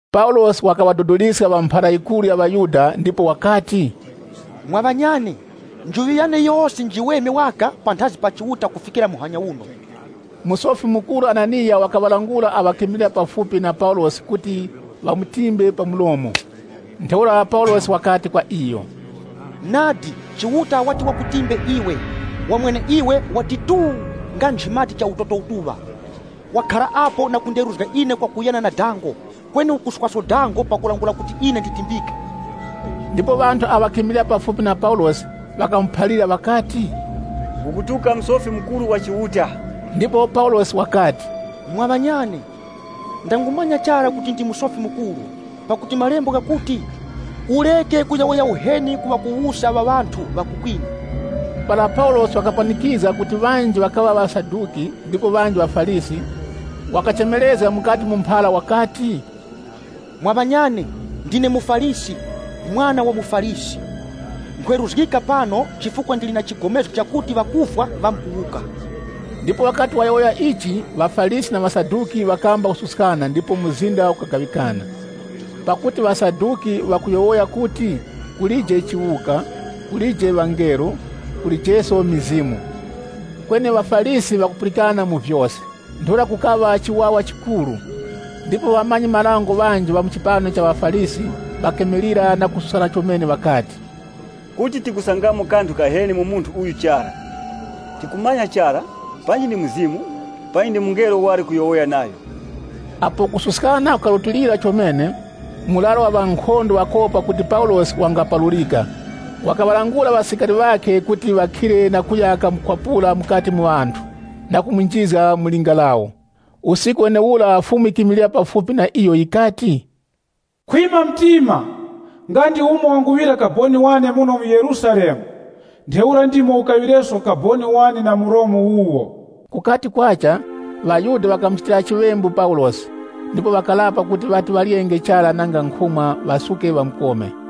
Paulosi wakaŵadodoliska ŵa mphara yikuru ya ŵaYuda ndipo wakati, “Mwa ŵanyane, ine ndakhara na njuŵi yiweme panthazi pa Chiuta kufikira muhanya uno.” Musofi Mukuru Hananiya wakaŵalangula awo ŵakimilira pafupi na Paulosi kuti ŵamutimbe pa mlomo. Ntheura Paulosi wakati kwa iyo, “Nadi Chiuta wati wakutimbe iwe, wa mweneiwe wati tuu nga nchimati cha utoto utuŵa! Wakhara apo na kunderuzga ine kwakuyana na dango, kweni ukuswaso dango pakulangula kuti ine nditimbike!” Ndipo ŵanthu awo ŵakimilira pafupi na Paulosi ŵakamuphalira ŵakati, “Ukutuka Musofi Mukuru wa Chiuta!” Ndipo Paulosi wakati “Mwa ŵanyane, ndangumanya chara kuti ndi Musofi Mukuru, pakuti Malembo ghakuti, ‘Ureke ungatukanga wakuwusa wa ŵanthu ŵa ku kwinu.’” Para Paulosi wakapanikizga kuti ŵanji ŵakaŵa ŵaSaduki, ndipo ŵanji ŵaFarisi, wakachemerezga mukati mu mphara wakati, “Mwa ŵanyane, ndine muFarisi, mwana wa muFarisi. Nkhweruzgika pano, chifukwa ndili na chigomezgo chakuti ŵakufwa ŵamkuwuka.” Ndipo wakati wayowoya ichi, ŵaFarisi na ŵaSaduki ŵakamba kususkana ndipo mzinda ukagaŵikana. (Pakuti ŵaSaduki ŵakuyowoya kuti, kulije chiwuka, kulije ŵangelo, kulijeso mizimu. Kweni ŵaFarisi ŵakupulikana mu vyose.) Ntheura kukaŵa chiwawa chikuru, ndipo ŵamanyi-marango ŵanji ŵa mu chipani cha ŵaFarisi ŵakimilira na kususka chomene, ŵakati, “Kuti tikusangamo kanthu kaheni mu munthu uyu chara. Tikumanya chara, panji ndi Mzimu, panji ndi mungelo wali kuyowoya nayo?” Apo kususkana kukarutilira chomene, murara wa ŵankhondo pakopa kuti Paulosi wangaparurika, wakaŵalangula ŵasilikari ŵakhe kuti ŵakhire na kuya kamukwapura mukati mu ŵanthu na kumunjizga mu linga lawo. Usiku wenewura Fumu yikimilira pafupi na iyo yikati, “Khwima mtima!” Nga ndi umo wanguŵira kaboni wane muno mu Yerusalemu, ntheura ndimo ukaŵireso kaboni wane na mu Romu wuwo. Kukati kwacha, ŵaYuda ŵakachitira chiŵembu Paulosi, ndipo ŵakarapa kuti ŵati ŵaryenge chara nanga nkhumwa, ŵasuke ŵamukome.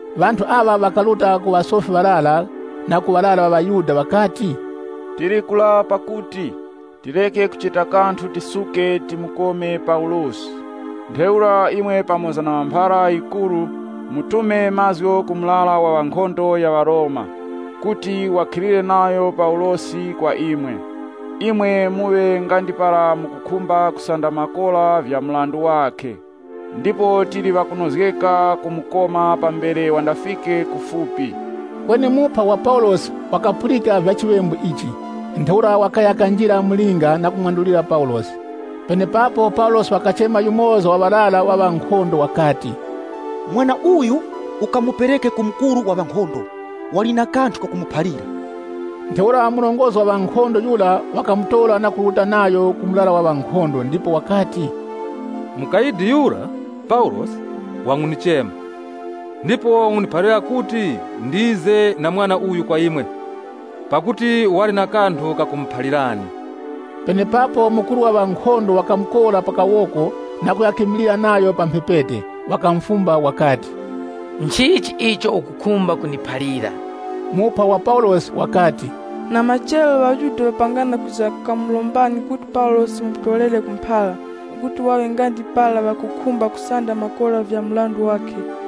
Ŵanthu aŵa ŵakaruta ku ŵasofi ŵarara na ku ŵarara ŵa ŵaYuda ŵakati, “Tili kurapa kuti, tireke kucheta kanthu tisuke timukome Paulosi. Ntheura imwe pamoza na ŵa mphara yikuru, mutume mazgu ku murara wa ŵankhondo ya ŵaRoma kuti ŵakhilire nayo Paulosi kwa imwe. Imwe muŵe nga ndi para mukukhumba kusanda makora vya mrandu wakhe. Ndipo tili ŵakunozgeka kumukoma pambere wandafike kufupi.” Kweni muphwa wa Paulosi wakapulika kuti ŵamkumukhazga, ntheura wakaya kanjira mu linga na kumwandulira Paulosi. Penepapo Paulosi wakachema yumoza wa ŵarara wa ŵankhondo wakati, “Mwana uyu ukamupereke ku mukuru wa ŵankhondo, wali na kanthu kakumuphalira.” Ntheura murongozgi wa ŵankhondo yura wakamutora na kuruta nayo ku murara wa ŵankhondo, ndipo wakati, “Mukayidi yura, Paulosi, wangundichema, ndipo wangundiphalira kuti ndize na mwana uyu kwa imwe, pakuti wali na kanthu kakumuphalirani.” Penepapo mukuru wa ŵankhondo wakamukora pa kawoko na kuya kamilira nayo pa mphepete, wakamufumba wakati, “Nchichi icho ukukhumba kundiphalira?” Muphwa wa Paulosi wakati, “Na machero, ŵaYuda ŵapangana kwiza kamurombani kuti Paulosi mumutorere ku mphara, kuti ŵaŵe nga ndi para ŵakukhumba kusanda makora vya mrandu wakhe.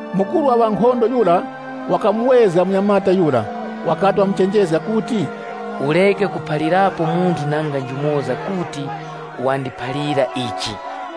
Mukuru wa ŵankhondo yura wakamuwezga munyamata yura, wakati wamuchenjezga kuti, “Ureke kuphalirapo munthu nanga njumoza kuti wandiphalira ichi.”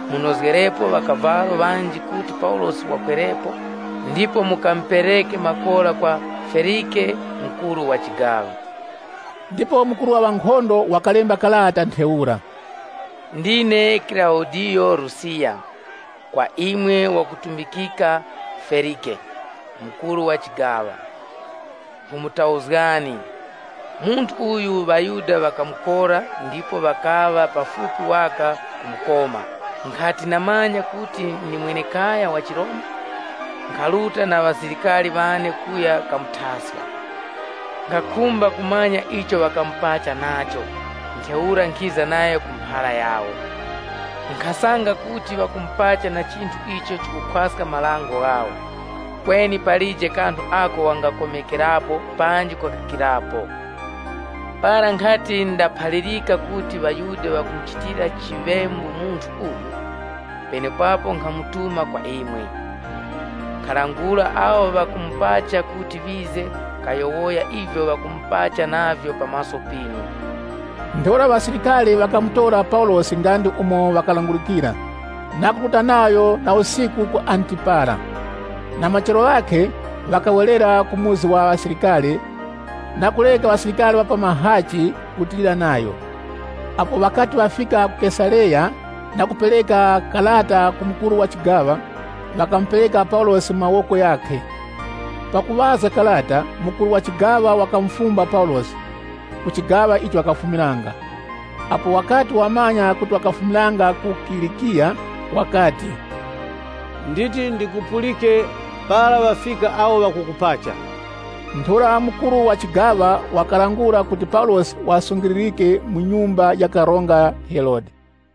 Munozgerepo ŵakavalo ŵanji kuti Paulosi wakwerepo, ndipo mukamupereke makora kwa Felike, mukuru wa chigaŵa.” Ndipo mukuru wa ŵankhondo wakalemba karata ntheura: “Ndine Kilaudiyo Lusiyasi, kwa imwe ŵakutumbikika Felike, mukuru wa chigaŵa. Nkhumutauzgani. Munthu uyu ŵaYuda ŵakamukora ndipo ŵakaŵa pafupi waka kumukoma. Nkhati ndamanya kuti ndi mwenekaya wa chiRoma, nkharuta na ŵasilikari ŵane kuya kamuthaska. Nkhakhumba kumanya icho ŵakamupacha nacho, ntheura nkhiza nayo ku mphara yawo. Nkhasanga kuti ŵakumupacha na chinthu icho chikukhwaska marango ghawo, kweni palije kanthu ako wangakomekerapo panji kukakikirapo. Para nkhati ndaphalirika kuti ŵaYuda ŵakumuchitira chiŵembu munthu uyu, penepapo nkhamutuma kwa imwe. Nkhalangula awo ŵakumupacha kuti ŵize kayowoya ivyo ŵakumupacha navyo pa maso pinu.” Ntheura ŵasilikari, ŵakamutora Paulosi nga ndi umo wakalangulikira, na kuruta nayo na usiku ku Antipatiri. Na machero ghakhe, ŵakawerera ku muzi wa ŵasilikari na kureka ŵasilikari ŵa pa mahachi kurutilira nayo. Apo ŵakati ŵafika ku Kesareya na kupereka karata ku mukuru wa chigaŵa, ŵakamupereka Paulosi mu mawoko ghakhe. Pakuŵazga karata, mukuru wa chigaŵa wakamufumba Paulosi, ku chigaŵa icho wakafumiranga. Apo wakati wamanya kuti wakafumiranga ku Kilikiya, wakati, “Nditi ndikupulike para ŵafika awo ŵakukupacha.” Ntheura mukuru wa chigaŵa wakalangula kuti Paulosi ŵasungilirike mu nyumba ya ufumu Herode.